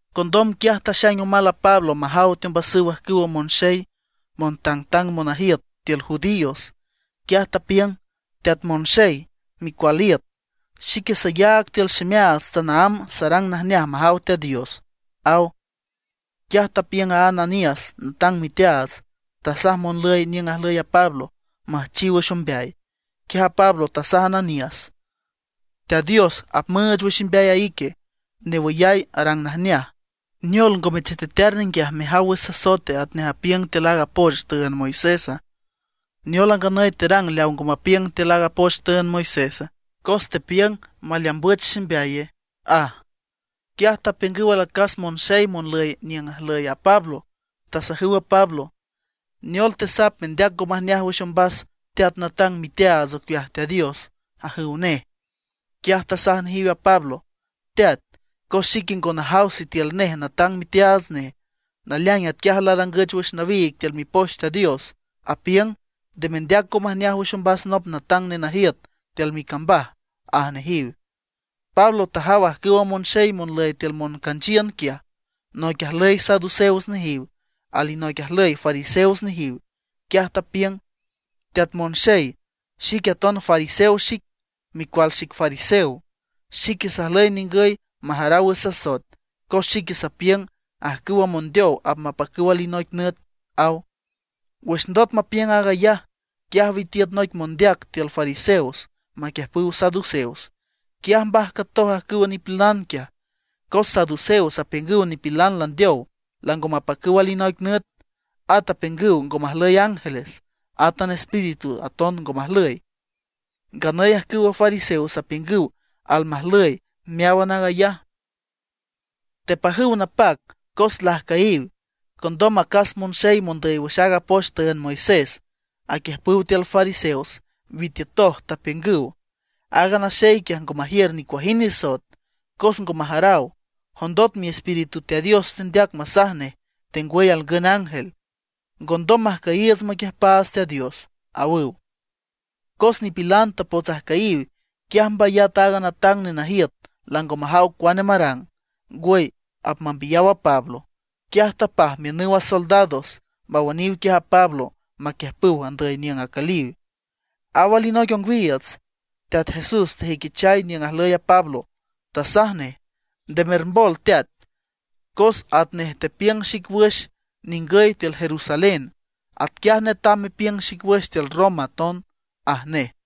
Condom quiaj taxaing omal a Pablo majaw teombasüw ajcüwa monxey montangtang monajiüt tiül judíos. Quiaj tapiüng: ―Teat monxey, micual iüt. Xique sayaag tiül ximeaats tanaámb sarang najneaj majaw Teat Dios ―aw. Quiaj tapiüng a Ananías natang miteaats, tasaj monlüy niüng ajlüy a Pablo müjchiw wüx ombeay. Quiaj a Pablo tasaj a Ananías: ―¡Teat Dios apmüüch wüx imbeay a ique newüyay arang najneaj! ¿Neol ngome chetetear ninguiaj mejaw wüx sasoete atnej apiüng tiül aaga poch tüünd Moisésa? ¿Neol a nganüy terang leaw ngo mapiüng tiül aaga poch tüünd Moisésa, cos tepiüng maleambüch ximbeaye? ―aj. Quiaj tapiüngüw alacas monxey monlüy niüng ajlüy a Pablo, tasajüw a Pablo: ―¿Neol tesap mendeac ngo majneaj wüx ombas teat natang miteaats ocueaj Teat Dios? ―ajüw nej. Quiaj tasaj nejiw a Pablo: ―Teat, cos xique ngo najaw sitiül nej natang miteaats nej. Naleaing atquiaj larangüch wüx nawiig tiül Mipoch Teat Dios, apiüng: “Nde mendeac ngo majneaj wüx ombas nop natang nenajiüt tiül micambaj” ―aj nejiw. Pablo tajaw ajcüwa monxey monlüy tiül moncanchiün quiaj, noic ajlüy saduceos nejiw, alinoic ajlüy fariseos nejiw, quiaj tapiüng: ―Teat monxey, xique aton fariseo xic, micual xic fariseo. Xique sajlüy ningüy majaraw wüx sasoet, cos xique sapiüng ajcüwa mondeow apmapacüw alinoic nüt ―aw. Wüx ndot mapiüng aag ayaj, quiaj witiüt noic mondeac tiül fariseos maquiüjpüw saduceos. Quiaj mbajcatoj ajcüwa nipilan quiaj. Cos saduceos apiüngüw nipilan landeow lango mapacüw alinoic nüt. At apiüngüw ngo majlüy ángeles, átan espíritus aton ngo majlüy. Nganüy ajcüwa fariseos apiüngüw almajlüy meáwan aag ayaj. Tepajüw napac cos lajcüyiw. Condom acas monxey mondüy wüx aaga poch tüünd Moisés, aquiüjpüw tiül fariseos, witiütoj, tapiüngüw: ―Aaga naxey quiaj, ngo majiür nicuajind nisoet. Cos ngo majaraw, jondot miespíritu Teat Dios tendeac masaj nej, tengwüy alngün ángel. Ngondom majcüyiiüts maquiüjpaats Teat Dios ―awüw. Cos nipilan tapots ajcüyiw, quiaj mbayat a natang nenajiüt, lango majaw cuane marang, ngwüy apmambiyaw a Pablo. Quiaj tapaj miünüw a soldados mawüniw quiaj a Pablo maquiüjpüw andüy niüng acüliw. Aw alinoic ongwiiüts, Teat Jesús tajüiquichay niüng ajlüy a Pablo, tasaj nej: ―Nde mermbol teat, cos atnej tepiüng xic wüx ningüy tiül Jerusalén, atquiaj netam mepiüng xic wüx tiül Roma aton ―aj nej.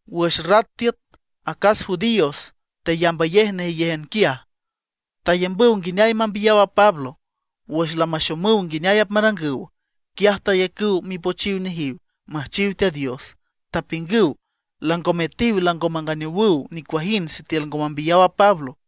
Wüx rat tiüt, acas judíos teyambayej nejeyéjan quiaj, tayambüw nguineay mambiyaw a Pablo. Wüx lamaxomüw nguineay apmarangüw, quiaj tayacüw mipochiw nejiw müjchiw Teat Dios, tapiüngüw lango metiw lango manganeowüw nicuajind sitiül ngo mambiyaw a Pablo.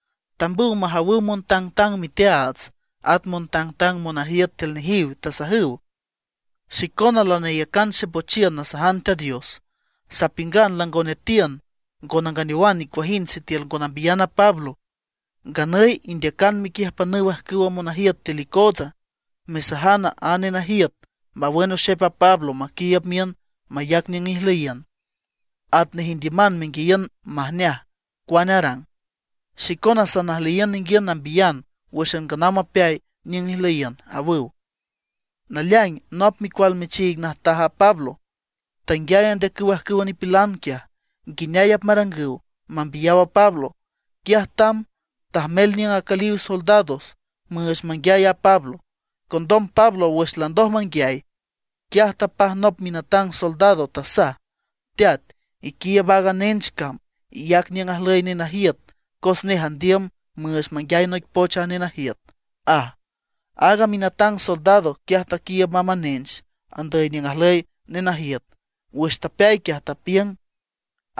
Tambüw majawüw montangtang miteaats at montangtang monajiüt tiül nejiw, tasajüw: ―Xicona lanayacan xepochiün nasajan Teat Dios, sapiüngan lango netiün ngo nanganeowan nicuajind sitiül ngo nambiyan a Pablo. Nganüy indeacan mequiüjpanüw ajcüwa monajiüt tiül icootsa mesajan a nenajiüt mawün oxep a Pablo maquiiüb miün mayac niüng ijlüyiün, atnej indiüman menguiayiün majneaj cuane arang. Xicona sanajlüyiün ninguiün nambiyan wǘxan nganaw mapeay niüng ijlüyiün ―awüw. Naleaing nop micual michiig najtaj a Pablo tanguiay andeacüw ajcüwa nipilan quiaj, nguineay apmarangüw mambiyaw a Pablo. Quiaj tamb, tajmel niüng acüliw soldados müüch manguiay a Pablo. Condom Pablo wüx landoj manguiay, quiaj tapaj nop minatang soldado, tasaj: ―Teat, iquiiüb aaga nench cam, iyac niüng ajlüy nenajiüt, cos nej andiüm müüch manguiay noic poch a nenajiüt ―aj. Aaga minatang soldado quiaj taquiiüb mamb a nench andüy niüng ajlüy nenajiüt. Wüx tapeay quiaj, tapiüng: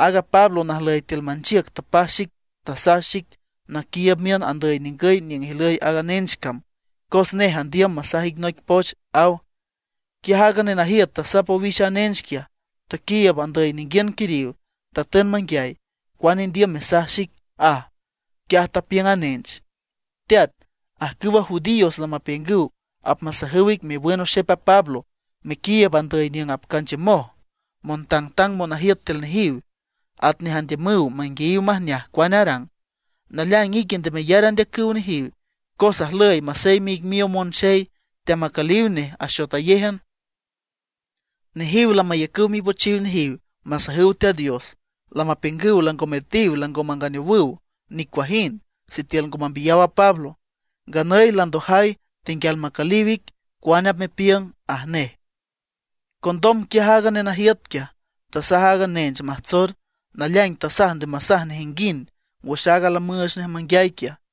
―Aaga Pablo najlüy tiül manchiüc tapaj xic, tasaj xic naquiiüb miün andüy ningüy niüng ijlüy aaga nench cam, cos nej andiüm masaj ic noic poch ―aw. Quiaj aaga nenajiüt tasap owix a nench quiaj, taquiiüb andüy ninguiün quiriw, tatün manguiay: ―¿Cuane indiüm mesaj xique? ―aj. Quiaj tapiüng a nench: ―Teat, ajcüwa judíos lamapiüngüw apmasajüw ic mewün oxep a Pablo, mequiiüb andüy niüng apcanchiümoj montangtang monajiüt tiül nejiw, atnej andiümüw manguiayiw majneaj cuane arang. Naleaing ique nde meyar andeacüw nejiw, cos ajlüy maseyme ic miow monxey teamacüliw nej axotayéjan. Nejiw lamayacüw mipochiw nejiw masajüw Teat Dios, lamapiüngüw lango metiw lango manganeowüw nicuajind sitiül ngo mambiyaw a Pablo. Nganüy landojay, tenguial macüliw ic cuane apmepiüng ―aj nej. Condom quiaj aaga nenajiüt quiaj, tasaj a nench majtsor, naleaing tasaj nde masaj nejinguind wüx aaga lamüüch nej manguiay quiaj.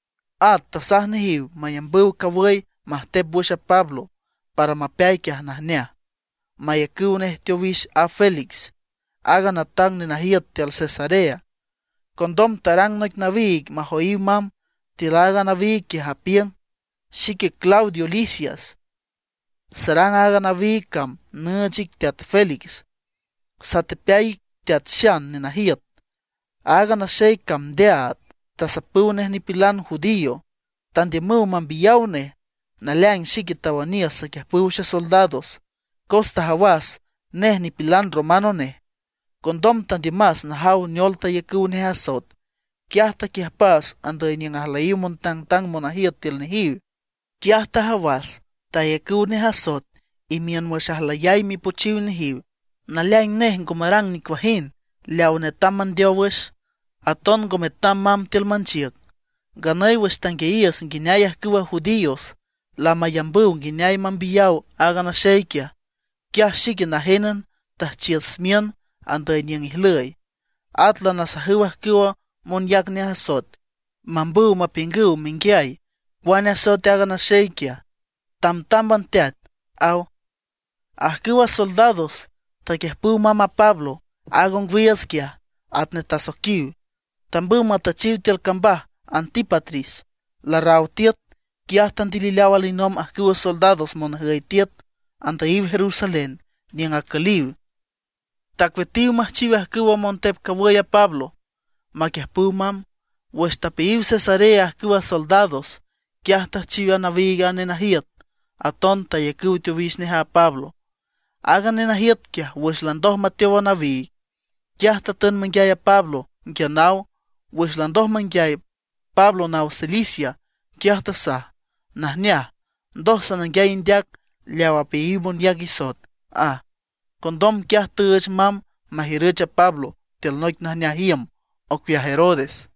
At tasaj nejiw mayambüw cawüy majtep wüx a Pablo, para mapeay quiaj najneaj, mayacüw nej teowix a Félix, aaga natang nenajiüt tiül Cesarea. Condom tarang noic nawiig majoyiw mamb. Tiül a nawiig quiaj, apiüng: “Xique Claudio Lisias, sarang aaga nawiig cam nüüch ic teat Félix, satepeay ic Teat Xan nenajiüt. Aaga naxey cam ndeaad, tasapüw nej nipilan judío; tandiümüw mambiyaw nej. Naleaing xique tawüniüs saquiüjpüw xesoldados, cos tajawas nej nipilan romano nej. Condom tandiümas najaw neol tayacüw nej asoet. Quiaj taquiüjpas andüy niüng ajlüyiw montangtang monajiüt tiül nejiw. Quiaj tajawas tayacüw nej asoet imiün wüx ajlüyay mipochiw nejiw. Naleaing nej ngo marang nicuajind leaw netam mandeow wüx, aton ngo metam mamb tiül manchiüc. Nganüy wüx tanguiayiüs nguineay ajcüwa judíos lamayambüw nguineay mambiyaw aaga naxey quiaj, quiaj xique najénan tüjchiüs miün andüy niüng ijlüy. At lanasajüw ajcüwa monyac nej asoet, mambüw mapiüngüw menguiay cuane asoet aaga naxey quiaj. Tamtámban teat”, aw. Ajcüwa soldados taquiüjpüw mamb a Pablo aaga ongwiiüts quiaj, atnej tasoiquiw, tambüw matüchiw tiül cambaj Antípatris. Larraw tiüt, quiaj tandilileaw alinomb ajcüwa soldados monjüy tiüt, andüyiw Jerusalén niüng acüliw. Tacueatiw müjchiw ajcüwa montep cawüy a Pablo maquiüjpüw mamb. Wüx tapeayiw Cesarea ajcüwa soldados, quiaj tüjchiw nawiig a nenajiüt; aton tayacüw teowix nej a Pablo. Aaga nenajiüt quiaj, wüx landoj mateow a nawiig, quiaj tatün manguiay a Pablo nguia naw. Wüx landoj manguiay Pablo naw Cilicia, quiaj tasaj: ―Najneaj, ndoj sananguiay indeac, leaw apeayiw monyac isoet ―aj. Condom quiaj tüüch mamb majiürüch a Pablo tiül noic najneaj iüm ocueaj Herodes.